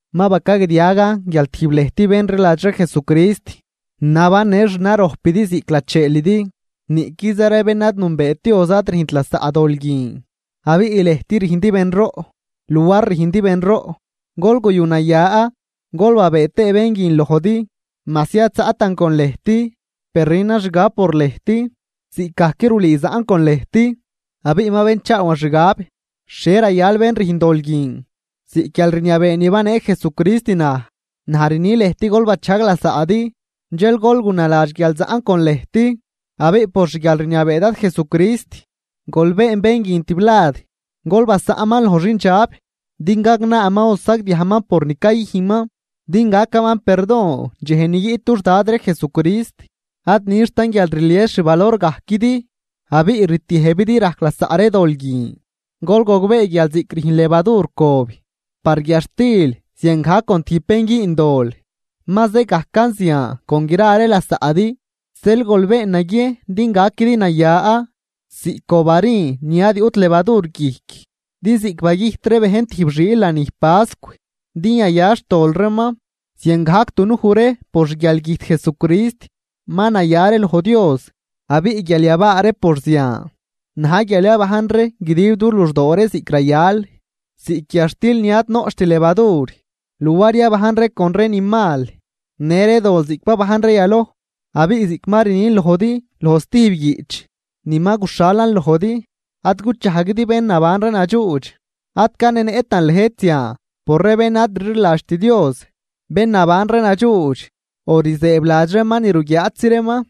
Ma bacagdiagan guial tijb lëjt bén rliladx ree Jesucrist nabannë xnarojpidi ziꞌc lacheelidi, niꞌquiza ree bén ad nünbeet Dios ad rüjnt lasaꞌ dol guin. Abiꞌ lëjt rüjndi benroꞌ, luar rüjndi benroꞌ gol guyunaya gol babëë tëë bén guin lojdi. Majsi ad zaꞌtan con lëjt, per rünan xgab por lëjt ziꞌcgajc rulüü zaꞌn con lëjt, abiꞌ ma benchaawan xgab xhie rayal bén rüjn dol guin. Ziꞌc guialrniabee ni banee Jesucrist naj, naj rni lëjt: “Gol bachajg lasaꞌdi.” Dxel gol gunaladx guial zaꞌn con lëjt abiꞌ por xguialrniabee Dad Jesucrist, gol been bén guin tiblad, gol basaꞌnman loj xindxab din gagnaaman o sagdiajman por ni cayüjnman din gacaman perdon dxej ni guiꞌt dux Dad ree Jesucrist. Ad nixtan guial rlies xvalorgajquidi abiꞌ rtiëjbidi rajc lasaꞌ ree dol guin. Gol gogbee guial ziꞌc rüjn levadur cob par guiadxtil ziangajc con tijb bén güün dol ma zë gajcan zian con gra ree lasaꞌdi. Zeel gol been naguiejn din gaquidi naya ziꞌc cob harin ni ad yuꞌt levadur guijc. Din ziꞌc bagüjt ree bejn tijb xiil lanij pascw din yaya xtol reeman, ziangajc dunuj ree por xguialgüjt Jesucrist ma naya ree loj Dios. Abiꞌ guial yabaa ree por zian na̱j guial yabajn ree guidib du luxdoo ree ziꞌc rayal, ziꞌc guiadxtil ni ad noꞌcht levadur, luar yabajn ree con ree ni mal në ree dol ziꞌc babajn ree yaloj. Abiꞌ ziꞌc ma rnin lojdi loj stijb guiꞌch ni ma guxhalan lojdi, ad guchajguidi bén naban ree nadxuudx. Ad canenëꞌtan lëjt zian por ree bén ad rliladxt Dios, bén naban ree nadxuudx o rzëëbladx reeman ni ruguiaaꞌtzi reeman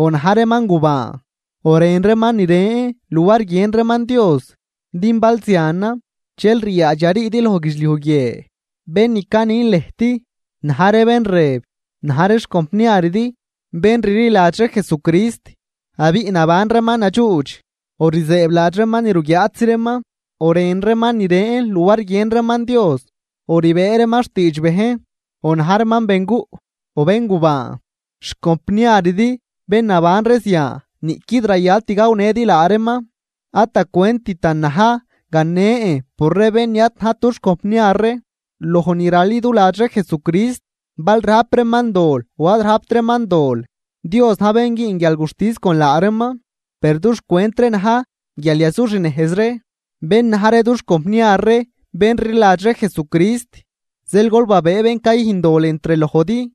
o na̱j reeman gubaan o rën reeman ni ren luar guiën reeman Dios, din bal zianan dxel ryaadx yariidi loj guidxliuj guie. Bén ni canin lëjt na̱j ree bén ni rëb na̱j ree xcompniaridi, bén rliladx ree Jesucrist abiꞌ naban reeman nadxuudx, o rzëëbladx reeman ni ruguiaatzi reeman, o rën reeman ni ren ree luar guiën reeman Dios, o rbëë reeman xtiidx bejn, o na̱j reeman benguꞌ, o béngubaan. Xcompniaridi bén naban ree zian niꞌquid rayalt gawnëdi laa reeman. Ad da cwenttan na̱j ganen por ree bén ni ad najt dux compniar ree loj ni raliduladx ree Jesucrist bal rajp reeman dol o ad rajpt reeman dol, Dios na̱j bén güün guialguxtis con laa reeman, per dux cwent ree na̱j guial yazuxnejz ree bén na̱j ree dux compniar ree bén rliladx ree Jesucrist. Zeel gol babëë bén cayüjn dol entr lojdi.